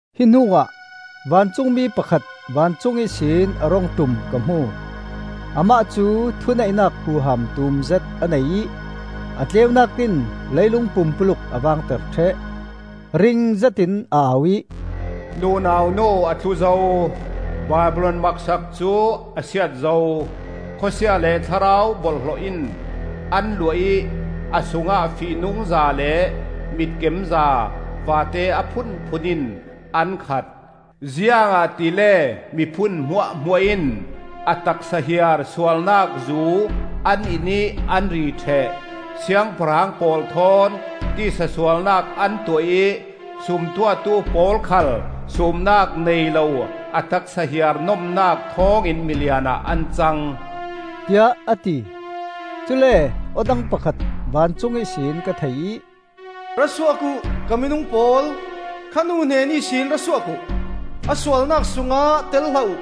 Hi hnuah vancungmi pakhat vancung ihsin a rung ṭum ka hmu. Amah cu thuneihnak huham tumzet a nei ih a tleunak in leilung pumpuluk a vangter ṭheh. Ring zetin a au ih, “Nunau nu a tlu zo! Babilon maksak cu a siat zo! Khawsia le thlarau borhhlawh in an luah ih a sungah fihnungza le mitkemza vate a phunphun in an khat. Ziangahtile miphun hmuahhmuah in a taksa hiar sualnak zu an in ih an ri ṭheh. Siangpahrang pawl thawn tisa sualnak an tuah ih sumtuahtu pawl khal supnak nei lo a taksa hiar nomnak thawngin milian ah an cang,” tiah a ti. Cule aw dang pakhat vancung ihsin ka thei ih, “Ra suak uh, ka minung pawl, Kha nu hnen ihsin ra suak uh. A sualnak sungah tel hlah uh,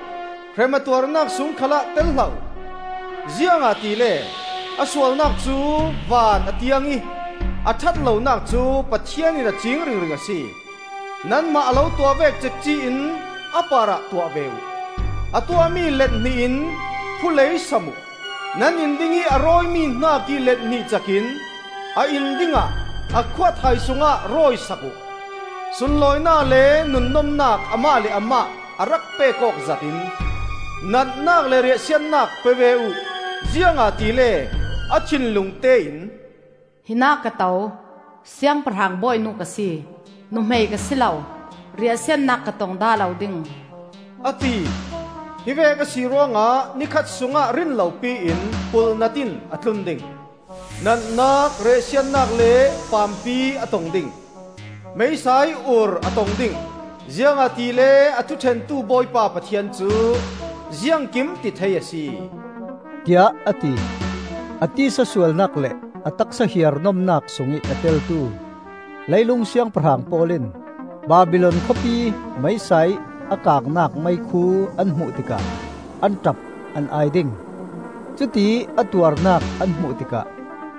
Hrem a tuarnak sung khalah tel hlah uh. Ziangahtile a sualnak cu van a tiang ih, A ṭhatlonak cu Pathian in a ciing ringring a si. Nanmah a lo tuah vek cekci-in a parah tuah ve uh. A tuahmi let hnih in phulei sam uh. Nan in dingih a rawimi hnakih let hnih cak in a in dingah a khuathai sungah rawi sak uh. Sunlawinak le nunnomnak amah le amah a rak pek awk zat in, natnak le riahsiatnak pe ve uh. Ziangahtile a thinlungte in, ‘Hinah ka to, siangpahrang bawinu ka si, nuhmei ka si lo, riahsiatnak ka tong dah lo ding,’ a ti. Hi vek a si ruangah ni khat sungah rinlopi in pulhnat in a tlun ding. Natnak, riahsiatnak le paampi a tong ding. Meisa ih ur a tong ding. Ziangahtile a thuṭhentu Bawipa Pathian cu Ziangkimtithei a si,” tiah a ti. A tisa sualnak le a taksa hiar nomnak sungih a teltu leilung siangpahrang pawl in Babilon khawpi meisa ih a kangnak meikhu an hmuh tikah an ṭap an ai ding. Cutiih a tuarnak an hmuh tikah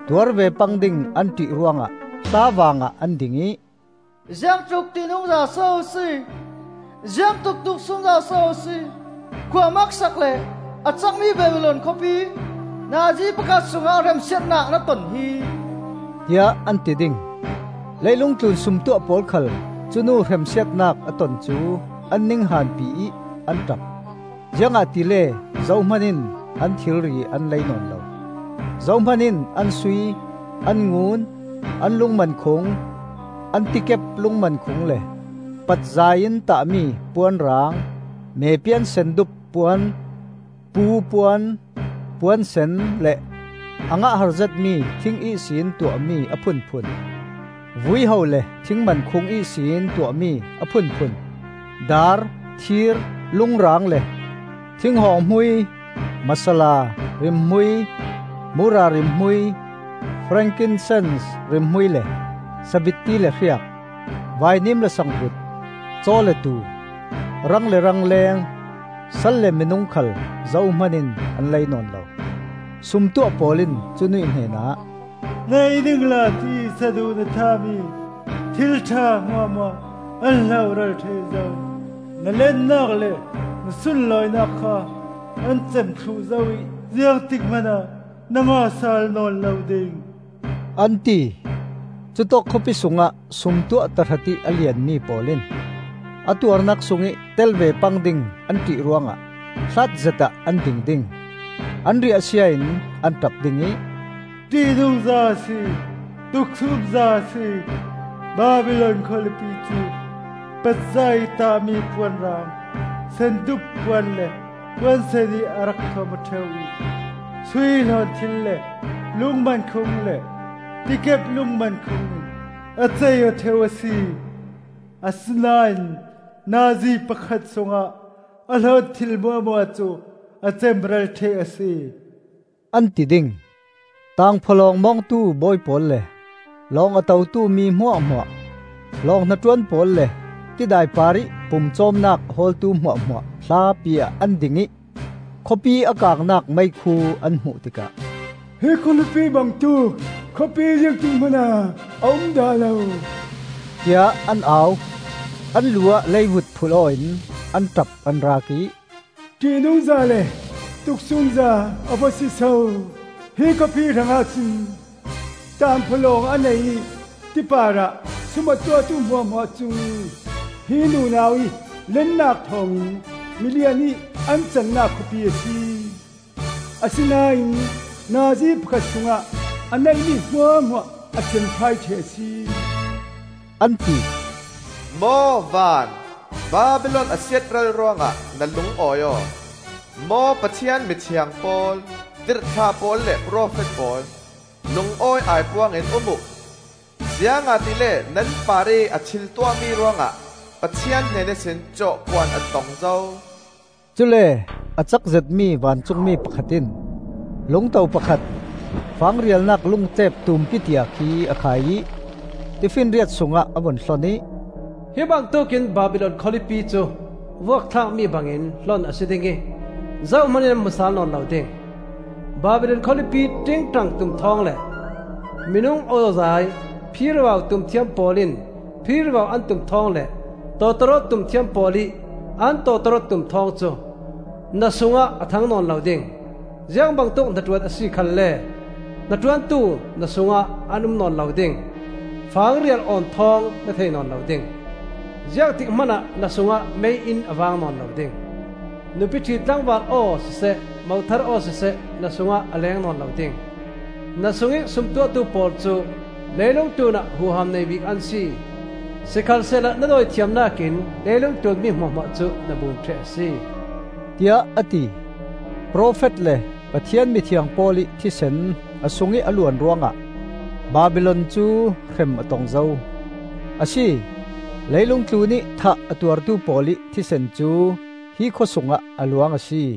tuar ve pang ding an ṭih ruangah hlavaang ah an ding ih, “Ziangtluk ṭihnungza so a si! Ziang tluk tuksumza so a si! Khua maksak le a cakmi Babilon khawlipi! Nazi pakhat sungah hremsiatnak na ton hi!” tiah an ti ding. Leilung tlun sumtuah pawl khal cu nu hremsiatnak a ton cu an ninghanpi ih an ṭap, ziangahtile zohman in an thilri an lei nawn lo. Zohman in an sui, an ngun, an lungmankhung, an tikep lungmankhung le patzai in tahmi puanrang, mepian sendup puan, pu puan, puan sen le a ngah har zetmi thing ihsin tuah mi a phunphun, vuiho le thing mankhung ihsin tuahmi a phunphun, daar, thir, lungrang le, thinghawng hmui, masala, rimhmui, mura rimhmui, frankinsens rimhmui le sabitti le hriak, vainim le sangvut, caw le tuu, rang le rangleng, sal le minung khal zohman in an lei nawn lo. Sumtuah pawl in cu nuih hnenah, “Nei ningla tiih saduh na thahmi thil ṭha hmuahhmuah an hloral ṭheh zo; na lennak le na sunlawinak kha an cem thluh zo ih ziangtik hmanah na ngah sal nawn lo ding,” an ti. Cutawk khawpi sungah sumtuah tahratih a lianmi pawl in a tuarnak sungih tel ve pang ding an ṭih ruangah hlatzet ah an ding ding. An riahsia in an ṭap ding ih, “ṭihnungza a si! Tuksumza a si! Babilon khawlipi cu! Patzai in tahmi puanrang, sendup puan le puan sen in a rak thuam aw ṭheu ih sui hlawnthil le lungmankhung le tikep lungmankhung in a cei-aw ṭheu a si. Asinain nazi pakhat sungah a hlawnthil hmuahhmuah cu a cemral ṭheh a si,” an ti ding. Tangphawlawng mawngtu bawi pawl le lawng a totu mi hmuahhmuah, lawng hnaṭuan pawl le tidai parih pumcawmnak a hawltu hmuahhmuah hlapi ah an ding ih, khawpi a kangnak meikhu an hmuh tikah, “Hi khawlipi bangtuk khawpi ziangtik hmanah a um dah lo,” tiah an au. An lu ah leivut phulh aw in an ṭap an raak ih, “ṭihnungza le tuksumza a va si so, hi khawpi hrangah cun! Tangphawlawng a nei ih ti parah sum a tuahtu hmuahhmuah cu hi nunau ih lennak thawngin milian ih an cannak khawpi a si. Asinain nazi pakhat sungah a neihmi hmuahhmuah a cemfai ṭheh a si!” an ti. Maw van, Babilon a siatral ruangah na lungawi aw! Maw Pathian mithiang pawl, tirhthlah pawl le profet pawl, lungawi aipuang in um uh! Ziangahtile nan parih a thiltuahmi ruangah Pathian hnen ihsin cawhkuan a tong zo. Cule a cak zetmi vancungmi pakhat in lungto pakhat, fang rialnak lungtlep tumpi tia khi a khai ih tifinriat sungah a vun hlon ih, “Hi bangtuk in Babilon khawlipi cu vuakthlakmi bangin hlon a si ding ih zohman in an hmu sal nawn lo ding. Babilon khawlipi ṭingṭang tum thawng le minung awzai, phirivau tum thiam pawl in phirivau an tum thawng le tawtawrawt tum thiam pawl ih an tawtawrawt tum thawng cu na sungah a thang nawn lo ding. Ziangbangtuk hnaṭuan a si khalle hnaṭuantu na sungah an um nawn lo ding. Fang rial awn thawng na thei nawn lo ding. Ziangtik hmanah na sungah mei-inn a vang nawn lo ding. Nupi ṭhi tlangval aw siseh mothar aw siseh na sungah a leng nawn lo ding. Na sungih sumtuahtu pawl cu leilung tlunah huham nei bik an si, sikhalsehla na dawithiamnak in leilungtlun mi hmuahhmuah cu na bum ṭheh a si,” tiah a ti. Profet le Pathian mithiang pawl ih thisen a sungih a luan ruangah Babilon cu hrem a tong zo. A si, leilung tlunih thah a tuartu pawl ih thisen cu hi khawsungah a luang a si.